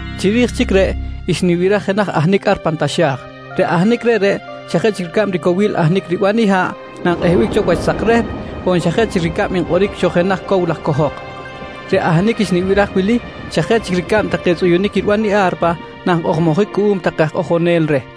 Chiri̱j chic reꞌ xnibiraj jenaj ahnic ar pan taxa̱j. Reꞌ ahnic reꞌreꞌ xa jeꞌ chic ricab cowil ahnic riban i haꞌ nankꞌehbic cho wach sak rehp on xa jeꞌ chic ricab nkꞌoric cho jenaj cow laj cohok. Reꞌ ahnic xnibiraj wili xa jeꞌ chic ricab take tzꞌuyunic riban i a̱rpa nankꞌojmojic cuꞌum take aj kꞌojonel reh.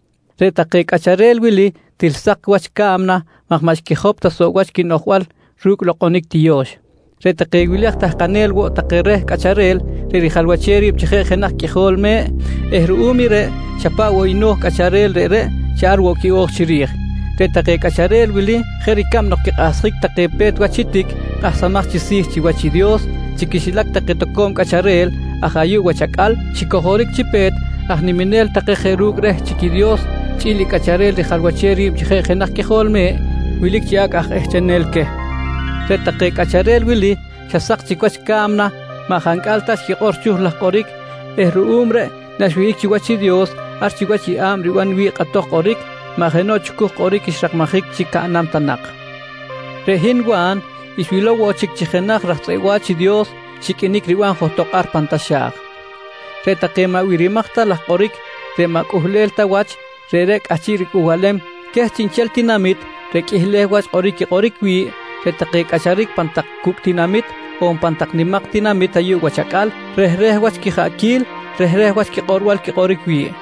Reꞌ take cꞌacharel wili til sak wach ca̱mna maj maꞌ xquijop ta wach quinoꞌjbal ru̱cꞌ lokꞌonic tiyo̱x. Reꞌ take wili aj tahkanel woꞌ take reh Cꞌacharel reꞌ rijalwachem ri̱b chi jeꞌ jenaj Qꞌuijol Me̱ꞌ eh ruꞌum i reꞌ xa paꞌ no̱j i cꞌacharel reꞌreꞌ ar woꞌ quiꞌo̱j chiri̱j. Reꞌ take cꞌacharel wili jeꞌ ricab nok quikꞌahsjic take pe̱t wach i tic kꞌahsamaj chi si̱ chiwach i Dios, chi quixilac take toco̱m cꞌacharel aj ayuꞌ wach acꞌal xicojoric chi pe̱t aj niminel take jeꞌ ru̱cꞌ reꞌ chic i Dios chꞌi̱l i Cꞌacharel rijalwachem ri̱b chi jeꞌ jenaj Qꞌuijol Me̱ꞌ wilic chi acꞌ aj ehchenel queh. Reꞌ take cꞌacharel wili xa sak chic wach ca̱mna maꞌ jancꞌal ta xquikꞌor chucuj laj kꞌoric eh ruꞌum reꞌ naxiwihꞌic chiwach i Dios ar chiwach i yeꞌa̱b riban wi̱ꞌ kꞌatoj kꞌoric, maꞌ jenoꞌ chucuj kꞌoric xrakmajic chi caꞌnam ta nak. Reꞌ hin Wa̱n xwilow woꞌ chic chi jenaj raj tzꞌeꞌ wa̱ch i Dios xiqꞌuinic riban johtok ar pan taxa̱j. Reꞌ take maꞌ birimaj ta laj kꞌoric reꞌ maꞌ cꞌuhlel ta wach, reꞌreꞌ cꞌahchiꞌ ricꞌuhbalem queh chiꞌnchel tinamit reꞌ qꞌuihleh wach kꞌoric quikꞌoric wi̱ꞌ, reꞌ take quicꞌacharic pan tak cucꞌ tinamit on pan tak nimak tinamit ayuꞌ wach acꞌal, reꞌ rehreh wach quijaꞌquil, rehreh wach quikꞌorbal quikꞌoric wi̱ꞌ.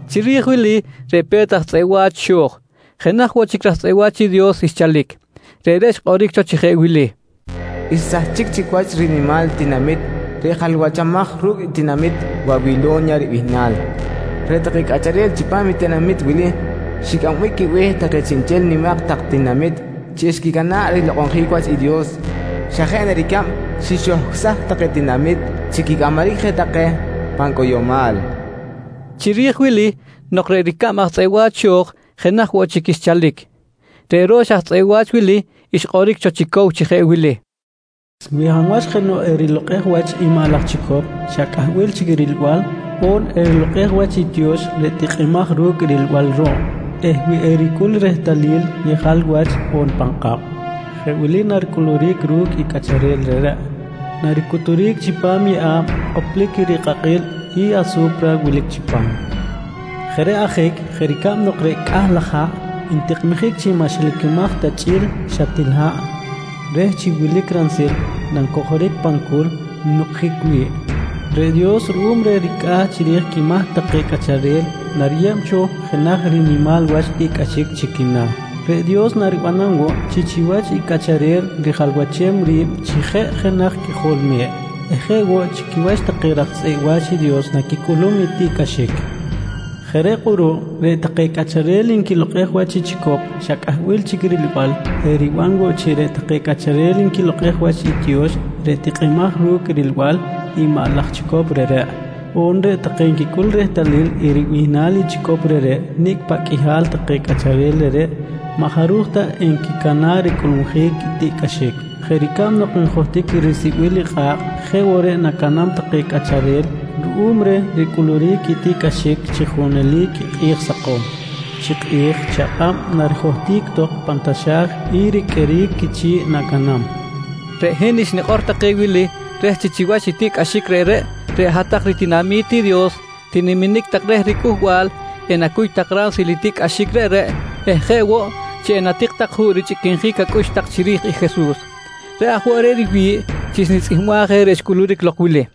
Chiri̱j wili reꞌ pe̱t aj tzꞌeꞌ wa̱ch xo̱j, jenaj woꞌ chic raj tzꞌeꞌ wa̱ch i Dios xchalic. Reꞌreꞌ xkꞌoric cho chi jeꞌ wili: «Xsahchic chic wach rinimal tinamit reꞌ jalwachamaj ru̱cꞌ i tinamit Wawilo̱nya ribihnal. Reꞌ take cꞌacharel chipam i tinamit wili xicꞌambic quibe̱h take chiꞌnchel nimak tak tinamit chi xquicana̱ꞌ rilokꞌonjic wach i Dios xa jeꞌ na ricab xixohcꞌsaj take tinamit chi quicꞌamaric je take pan cꞌoyomal, nqui xikꞌor. Chiri̱j wili nok reꞌ ricab aj tzꞌeꞌ wa̱ch xo̱j, jenaj woꞌ chic xchalic. Reꞌ ro̱x aj tzꞌeꞌ wa̱ch wili xkꞌoric cho chi cow chi jeꞌ wili: «Wi hab wach jenoꞌ erilokꞌej wach i maꞌ laj chicop xa cꞌahbil chic rilbal on erilokꞌej wach i tiyo̱x reꞌ tikꞌimaj ru̱cꞌ rilbal ruꞌ eh wi ericꞌul i rehtalil yejal wach on pan kꞌab, jeꞌ wili naricꞌuluric ru̱cꞌ i cꞌacharel reꞌreꞌ: Naricuturic chipam i yeꞌa̱b koplic rikꞌakꞌil i asu̱pra wilic chipam. Jeꞌ reꞌ ajic, jeꞌ ricab nok reꞌ cꞌah laj haꞌ ntikꞌmijic chi maꞌ xilacamaj ta chꞌi̱l xa til haꞌ reh chi wilic ransil nancojoric pan culc nucꞌjic wi̱ꞌ, reꞌ Dios ruꞌum reh ricꞌa̱ chiri̱j quimahc take cꞌacharel nariyeb cho jenaj rinimal wach tiꞌcꞌaxic chi quina̱. Reꞌ Dios naribanam woꞌ chi chiwach i Cꞌacharel rijalwachem ri̱b chi jeꞌ jenaj Qꞌuijol Me̱ꞌ eh jeꞌ woꞌ chi quiwach take raj tzꞌeꞌ wa̱ch i Dios, naquicꞌulum i tiꞌcꞌaxic. «Jeꞌ reꞌ kꞌuruꞌ, reꞌ take cꞌacharel nquilokꞌej wach i chicop xa cꞌahbil chic rilbal eh riban woꞌ chi reꞌ take cꞌacharel nquilokꞌej wach i tiyo̱x reꞌ tikꞌimaj ru̱cꞌ rilbal i maꞌ laj chicop reꞌreꞌ, on reꞌ take nquicꞌul rehtalil i ribihnal i chicop reꞌreꞌ, nicꞌ paꞌ qꞌuihal take cꞌacharel reꞌreꞌ maꞌ jaruj ta enquicana̱ꞌ ricꞌulmujic i tiꞌcꞌaxic. Jeꞌ ricab nok njohtic i risibil i kꞌa̱kꞌ jeꞌ woꞌ reꞌ nacaꞌnam take cꞌacharel ruꞌum reh ricꞌuluric i tiꞌcꞌaxic chi junelic i kꞌi̱j sakom, chi kꞌi̱j chi akꞌab narijohtic tok pan taxa̱j i riqꞌueric quichi̱ꞌ nacaꞌnam, nqui xikꞌor. Reꞌ hin xnikꞌor take wili reh chi chiwach i tiꞌcꞌaxic reꞌreꞌ, reꞌ hat-tak ritinami̱t i Dios tiniminic tak reh riCꞌuhbal, enacuy tak ransil i tiꞌcꞌaxic reꞌreꞌ eh jeꞌ woꞌ chi enatik tak juꞌ richꞌiquinjic acꞌux tak chiri̱j i Jesus. Reꞌ aj woꞌ reꞌ riwi̱ꞌ chi xnitzꞌihmbaj reꞌ xcꞌuluric lok wili: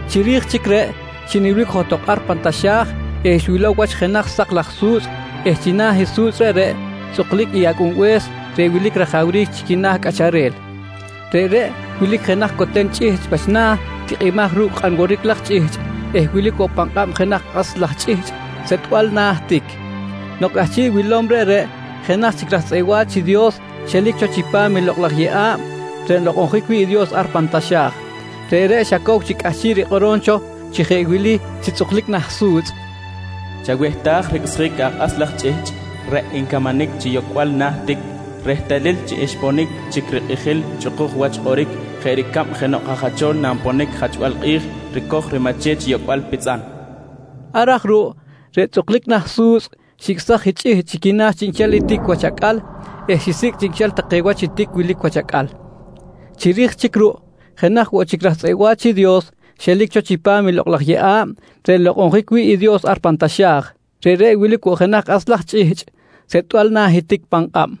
Chiri̱j chic reꞌ, xinilbic johtok ar pan taxa̱j eh xwilow wach jenaj sak laj su̱tzꞌ eh china̱ i su̱tzꞌ reꞌreꞌ tzꞌuklic i Acꞌunbe̱s reꞌ wilic rajawric chi quina̱ cꞌacharel. Reꞌreꞌ wilic jenaj coten chꞌihchꞌ wach na̱ tikꞌimaj ru̱cꞌ kꞌan woric laj chꞌihchꞌ eh wilic woꞌ pan kꞌab jenaj kꞌas laj chꞌihchꞌ setꞌbal na̱ tic. Nok cꞌahchiꞌ wilom reꞌreꞌ, jenaj chic raj tzꞌeꞌ wa̱ch i Dios xelic cho chipam i Lokꞌ laj Yeꞌa̱b reꞌ nlokꞌonjic wi̱ꞌ i Dios ar pan taxa̱j. Reꞌreꞌ xa cow chic cꞌahchiꞌ rikꞌorom cho chi jeꞌ wili chi tzꞌuklic nah su̱tzꞌ: «Chawehtaj ricꞌsjic i akꞌas laj chꞌihchꞌ reꞌ ncamanic chi yocꞌbal na̱ tic rehtalil chi xponic chic rikꞌijil i chꞌukuj wach kꞌoric jeꞌ ricab jenoꞌ aj jacho̱l nanponic i jachbal kꞌi̱j ricoj i rimache̱t chi yocꞌbal pitzꞌan, nqui reh. Ar aj ruꞌ reꞌ tzꞌuklic na̱ su̱tzꞌ xicꞌsaj i chꞌihchꞌ chi quina̱ chiꞌnchel i tic wach acꞌal eh xisicꞌ chiꞌnchel take wach i tic wilic wach acꞌal. Chiri̱j chic ruꞌ jenaj woꞌ chic raj tzꞌeꞌ wa̱ch i Dios xelic cho chipam i Lokꞌ laj Yeꞌa̱b reꞌ nlokꞌonjic wi̱ꞌ i Dios ar pan taxa̱j. Reꞌreꞌ wilic woꞌ jenaj kꞌas laj chꞌihchꞌ setꞌbal na̱ i tic pan kꞌab.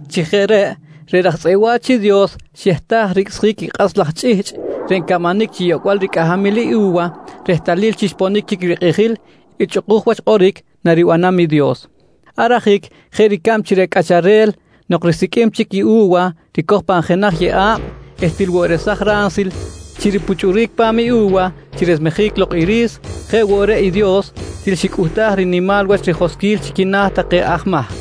Chi jeꞌ reꞌ, reꞌ raj tzꞌeꞌ wa̱ch i Dios xehtaj ricꞌsjic i kꞌas laj chꞌihchꞌ reꞌ ncamanic chi yocꞌbal ricꞌahamil i u̱wa, rehtalil chi xponic chic rikꞌijil i chꞌukuj wach kꞌoric naribanam i Dios. Ar ajic jeꞌ ricab chi reꞌ cꞌacharel nok risiqꞌuim chic i u̱wa ricoj pan jenaj yeꞌa̱b eh til woꞌ resaj ransil chi ripuchꞌuric pa̱m i u̱wa chi resmejic lok i ri̱s, jeꞌ woꞌ reꞌ i Dios til xicꞌuhtaj rinimal wach rijoskꞌil chi quina̱ take aj mahc.